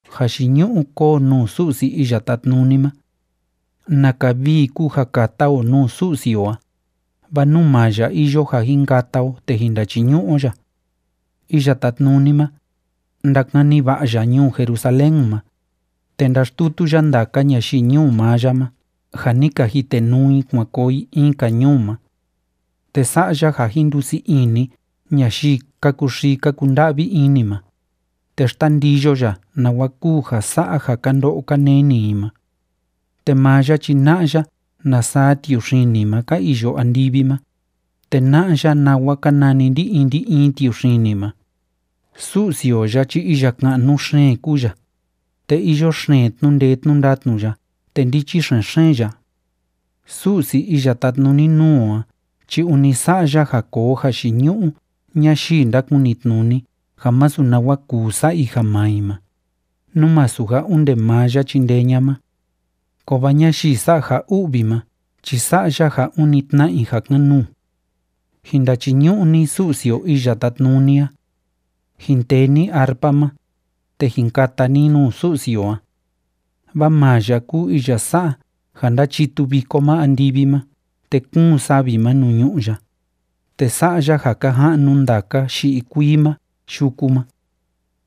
¡Jayiñu'u kóo nuu Su'si Iya Tátnuni ma! ¡Naka vii kúu ja kata o nuu Su'si o a, vaa nuu maa ya iyo ja jin kata o te jin ndachiñu'u o ya! Iya Tátnuni ma, ndakani va'a ya ñuu Jerusalén ma, te ndaxtutu ya ndaka ñayii ñuu maa ya ma ja ni ka jitenuu i kuan koo i in‑ka ñuu ma. Te sa'a ya ja jin ndusii ini ñayii ka kuxii ka kunda'vi ini ma, te xtandiyo ya nawa kúu ja sa'a ja ka ndo'o ka neni i ma. Te maa ya chi na'a ya na saa tiuxini ma ka iyo andivi ma, te na'a ya nawa ka nani ndi‑in ndi‑in tiuxini ma. Su'si o ya chi iya ka'nu xeen kúu ya, te iyo xeen tnu'u ndee tnu'u ndatnu ya, te ndichi xen‑xeen ya. Su'si iya tátnuni nuu o a chi ûni sa'a ya ja koo jayiñu'u ñayii ndákunitnuni ja masu nawa kuu sa'a i ja maa i ma, nú masu ja onde maa ya chindee ña'a ma. Kovaa ñayii sa'a ja u'vi ma chi sa'a ya ja ûni tna'a i ja kan‑nuu. Jin ndachiñu'u ni Su'si o Iya Tátnuni a. Jin tee ni arpa ma, te jin kata ni nuu Su'si o a. Vaa maa ya kúu iya sa'a ja ndáchitu viko ma andivi ma te kúun savi nuu ñu'ú ya, te sa'a ya ja ka ja'nu ndaka yi'i kuii ma yuku ma.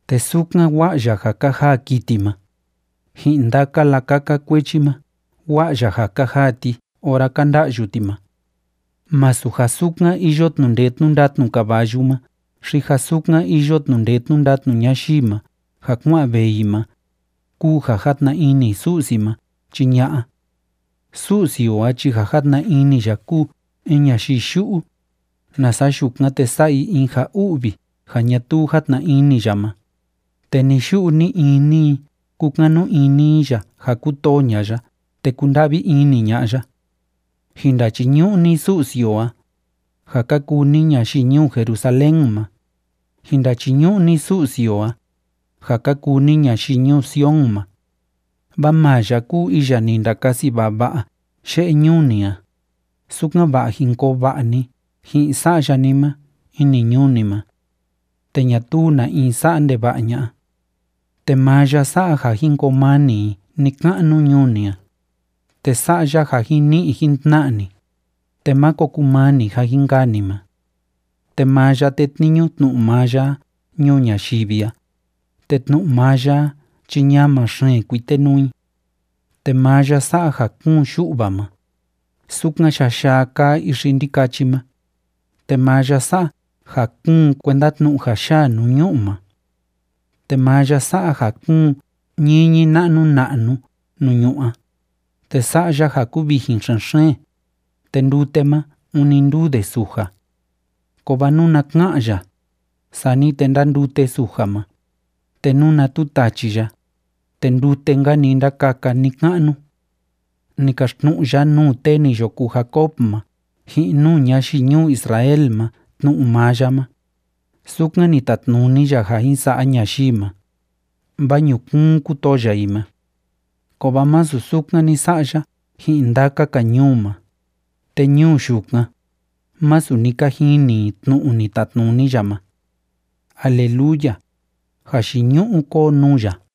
Te sukan wa'a ya ja ka jaa kiti ma, ji'in ndaka lakaka kuechi ma, wa'a ya ja ka jaa ti ora ka nda'yu ti ma. Másu ja sukan iyo tnu'u ndee tnu'u ndatnu caballu ma xi ja sukan iyo tnu'u ndee tnu'u ndatnu ñayii ma ja kua'an vee i ma, kúu ja játna ini Su'si ma chi ña'a. Su'si o a chi ja játna ini ya kúu in ñayii yu'u, nasa yukan, te sa'a i in ja u'vi ja ñatuu játna ini ya ma, te ni‑yu'u ni‑ini i kúkanu ini i ya ja kútoo ña'a ya te kúnda'vi ini ña'a ya. Jin ndachiñu'u ni Su'si o a, ja ka kuu ni ñayii ñuu Jerusalén ma. Jin ndachiñu'u ni Su'si o a, ja ka kuu ni ñayii ñuu Sion ma. Vaa maa ya kúu iya ni ndakasi vava'a ye'e ñuu ni a, sukan‑va'a jin koo va'a ni ji'in sa'ya ni ma ini ñuu ni ma te ñatuu na in sa'a ndeva'a ña'a. Te maa ya sa'a ja jin koo mani i ni‑ka'nu ñuu ni a, te sa'a ya ja jin ni'i jin tna'a ni, te máko kumani ja jin kaa ni ma. Te maa ya tétniñu tnu'u maa ya a ñuu ñayivi a, te tnu'u maa ya a chi ñama xeen kuitenuu i. Te maa ya sa'a ja kúun yu'va ma, sukan yaa yaa kaa ixi ndikachi ma, te maa ya sa'a ja kúun kuenda tnu'u ja yaa nuu ñu'u ma. Te maa ya sa'a ja kúun ñiñi na'nu na'nu nuu ñu'ú a, te sa'a ya ja kúvijin xen‑xeen, te ndute ma, ûni ndúu de suja. Kovaa nuna ka'an ya, sani te ndándute suja ma, te nuna tutachi ya, te ndute‑nka‑ni ndákaka ni‑ka'nu. Ni kaxtnu'u ya nuu tee ni yo kuu Jacob ma ji'in nuu ñayii ñuu Israel ma tnu'u maa ya ma, sukan ni tatnuni ya ja jin sa'a ñayii ma, vaa ñukuun kútoo ya i ma. Kovaa masu sukan ni sa'a ya ji'in ndaka‑ka ñuu ma, te ñuu yukan, másu ni ka jini i tnu'u ni tatnuni ya ma. ¡Aleluya! ¡Jayiñu'u kóo nuu ya!